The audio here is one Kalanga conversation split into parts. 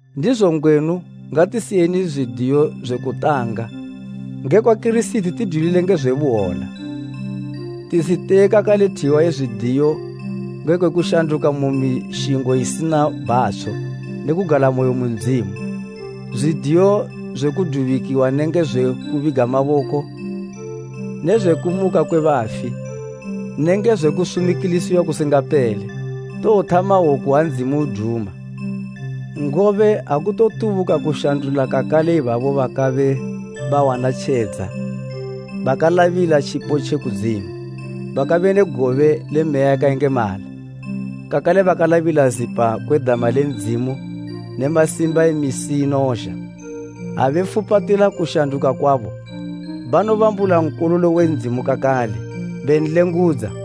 Ndizo ngwenu ngatisiyeni zwidiyo zwe kutanga ngekwa Kirisiti tidwilile nge zwe buhwola. Tisiteye kakale thiwa ye zwidiyo ngekwe kushanduka mu mishingo isina bhatsho ne kugalamoyo mu Ndzimu, zwidiyo zwe kudubikiwa kudubikiwa: Kene “nshingo we kutjenesa.” nenge zwe kubiga maboko ne zwe kumuka kwe bafi nenge zwe kusumikilisiwa kusingapele. Towothama woku ha Ndzimu uduma. Ngobe akutotubuka kushandula kakale ibabo bakabe bawana tjedza bakalabila tjipo tje kudzimu, bakabe ne gobe le Meya yakayengemala, kakale bakalabila zipa kwe dama le Ndzimu ne masimba e misi inozha, ha befupatila kushanduka kwabo, banobambula Nkololo we Ndzimu kakale, benlengudza.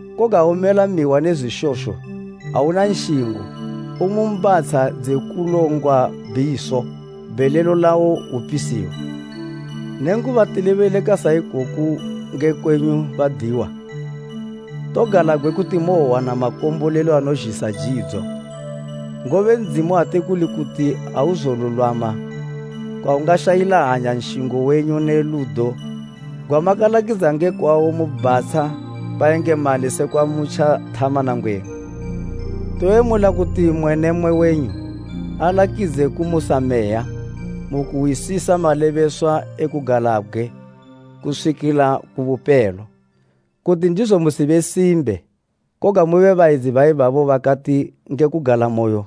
Koga ha umela mihwa ne zwishosho auna nshingo, umu mbatsha dze kulongwa bhiso, bhelelo lawo hwupisiwa. Nenguba tilebeleka sa ikoku nge kwenyu badiwa, togalabgwe kuti mowowana makombolelo anozhisa jidzo. Ngobe Ndzimu ate kuli kuti auzolulwama kwawungashayila hanya nshingo wenyu ne ludo gwamakalakidza nge kwawo mu bhatsha bayengemali sekwa mutja thama nangwenu. Toyemula kuti mmwe ne mmwe wenyu alakidze kumusa meya mu kuhwisisa malebeswa e kugalabgwe kuswikila ku bupelo. Kuti ndizo musibe simbe, koga mube bayedzi baibabo bakati nge kugalamoyo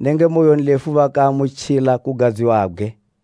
nenge moyonlefu bakaamutjila kugadziwabgwe.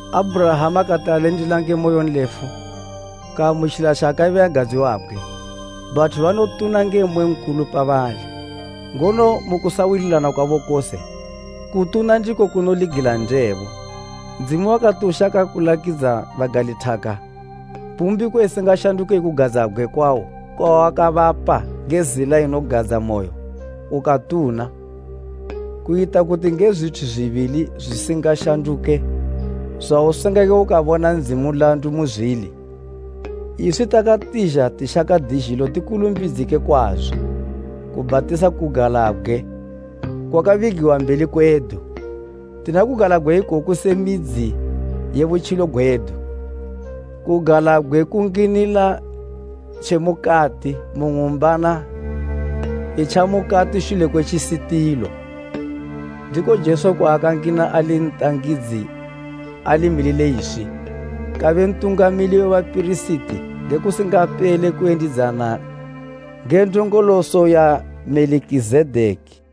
Abhurahama kati alindila nge moyonlefu, kaamutjila tjaakabe agadziwabgwe. Bathu banotuna nge mmwe nkulu pabali, ngono mu kusawililana kwabo kose, kutuna ndiko kunoligila ndebo. Ndzimu wakati ushaka kulakidza bagalithaka mbumbiko isingashanduke ye kugadzabgwe kwawo kwawakabapa nge zila inogadzamoyo, ukatuna, kuyita kuti nge zwithu zwibili zwisingashanduke zwausingake ukabona Ndzimu nlandu muzwili, iswi takatizha tishaka dizhilo tikulumbidzike kwazo kubhatisa kugalabgwe kwakabigiwa mbeli kwedu. Tina kugalabgwe ikoku se midzi ye butjilo gwedu, kugalabgwe kunginila tjemukati mu ng'umbana itja mukati shule kwe tjisitilo, ndiko Jesu kwaakangina ali ntangidzi alimilile iswi, kabe Ntungamili we bapirisiti nge kusingapele kuyendidzana nge ndongoloso ya Melikizedeki.